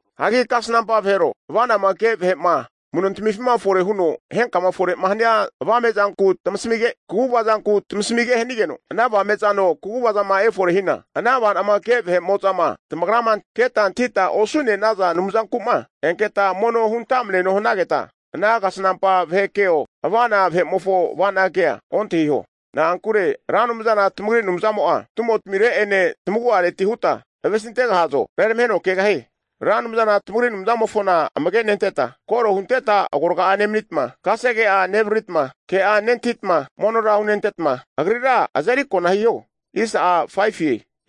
Hagi kasnampa vahero, ava'nama ke vahe'ma amu'notmifima fore huno henkama fore'ma hania avame'zanku tamasamige, kaguvazanku tamasamige hanigeno, ana avame'zano kaguvazama efore hina, ana ava'nama ke vahe'mo'zama tamagrama antahita keta osu'ne'naza anumzanku'ma enketa mono huntamneno hanagetma, ana kasanampa vahe keo, ava'na vahe'mofo ava'na kea ontahiho. Na'ankure Ra Anumzana tamagri Anumzamo'a tumotamireti'ene tamagu'areti huta avesintegahazo, reramaheno kegahie. Ra Anumzana tamagri Anumzamofona amage'nentetma, koro huntetma agorga'a nemanitma, kasege'a nevariritma, ke'a nentahitma monora hunentetma, Agrira azeri kona hiho.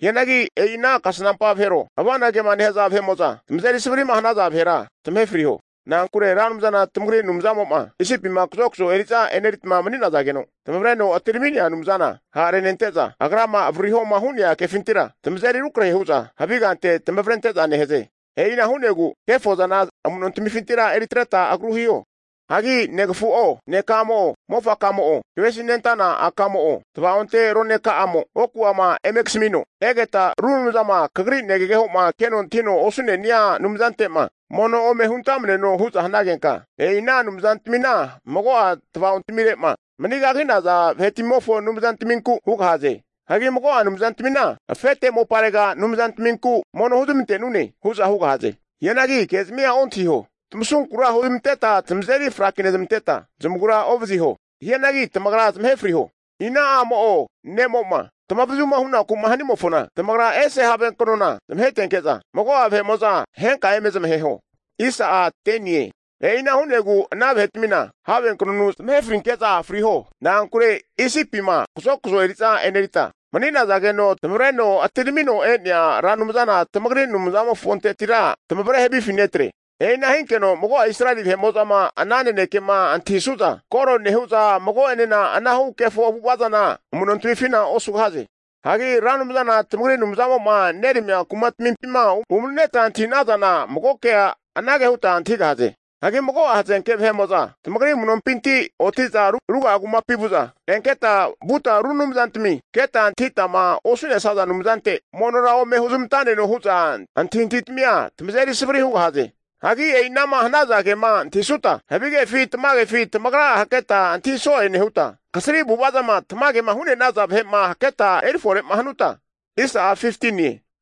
Hianagi e'i ana kasanampa vahero ava'na kema nehaza vahe'mo'zama tamazeri savari'ma hanaza vahera, zamahe friho. Na'ankure Ra Anumzana tamagri Anumzamo'ma Isipima kazokazo eri'za e'neritma mani'nazageno tamavreno atirami'nea Anumzana ha'renente'za, Agrama avaririhoma hu'nea kefintira tamazeri rukrahe hu'za havigante tamavrente'za nehaze. E'ina hu'negu kefozana amu'no tamifintira eritretma agru hiho. Hagi negafu'o, neka'amo'o, mofaka'amo'o, kavesinente'nana a'ka'amo'o, tavaonte roneka'amo oku'ama eme kasamino, egeta ru anumzama kagri negageho'ma keno antahino osu'nenia anumzante'ma mono ome huntamneno hu'za hanagenka, e'i ana anumzantmina mago'a tavaontamire'ma manigagi'naza vahe'tmimofo anumzantminku hugahaze. Hagi mago'a anumzantmina afete moparega anumzantminku mono huzmante'nune hu'za hugahaze. Hianagi kezmia ontahiho. Tamasunkura huzamanteta zamazeri frakinezmanteta zamagura ovaziho. Hianagi tamagra zamahe friho. Ina a'mo'o ne'mo'ma tamavazuma hunaku'ma hanimofona tamagra ese havenknona zmahetenke'za, mago'a vahe'mo'za henka eme zamaheho. E'ina hu'negu ana vahetmina havenknonu zamahe frinke'za friho. Na'ankure Isipima kazokazo eri'za e'nerita mani'nazageno tamavreno atiramino'ma e'nea Ra Anumzana tamagri Anumzamofontetira tamavre havifi netre. E'ina hinkeno mago'a Israeli vahe'mo'zama ana nanekema antahisu'za, koro nehu'za mago'enena anahu kefo avu'ava zana amu'nontamifina osugahaze. Hagi Ra Anumzana tamagri Anumzamo'ma neramia kumatamimpi umani'neta antahi'nazana, mago kea anage huta antahigahaze. Hagi mago'a hazenke vahe'mo'za tamagri amu'nompinti oti'za ruga'a kumapi vu'za, enketa vuta ru anumzantami keta antahitama osu'nesaza anumzante monora ome huzmantamneno hu'za antahintahitamia tamazeri savari hugahaze. Hagi e'inama hanaza kema antahisuta, havigefi tamagefi tamagra'a hakreta antahi so'e nehuta, kasri avu'avazama tamagema hu'ne'naza vahe'ma haketa erifore'ma hanuta,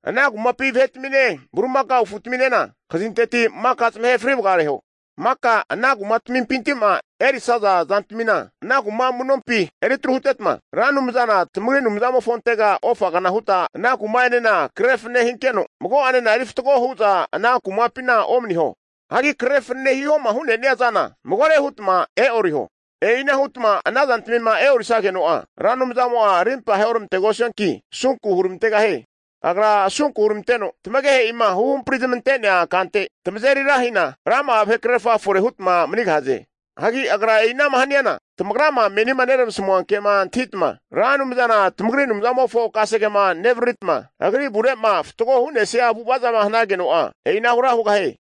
ana kumapi vahe'tamine bulimakao afutaminena, kazinteti maka zamahe fri vagareho. Maka ana kumapinti'ma erisaza zantamina ana kuma amu'nompi eritru hutetma, Ra Anumzana tamagri Anumzamofontega ofagna hutma ana kuma'enena krefanane hinkeno, mago'anena eri fatgo hu'za ana kumapina omaniho. Hagi krefanane hihoma hu'nenia zana magore hutma e'oriho. E'ina hutama ana zantmima e'orisageno'a, Ra Anumzamo'a rimpa aheoramantegosianki, asunku huramantegahie. Agra asunku huramanteno, tamagehe'ima huhampri zamante'nea kante tamazeri ra hina, rama'a vahekrerfa fore hutma manigahaze. Hagi Agra e'inama haniana tamagrama menima neramasmua kema antahitama Ra Anumzana tamagri Anumzamofo kasegema nevariritma, Agri avure'ma fatgo hu'nesia avu'avazama hanageno'a, e'inahura hugahie.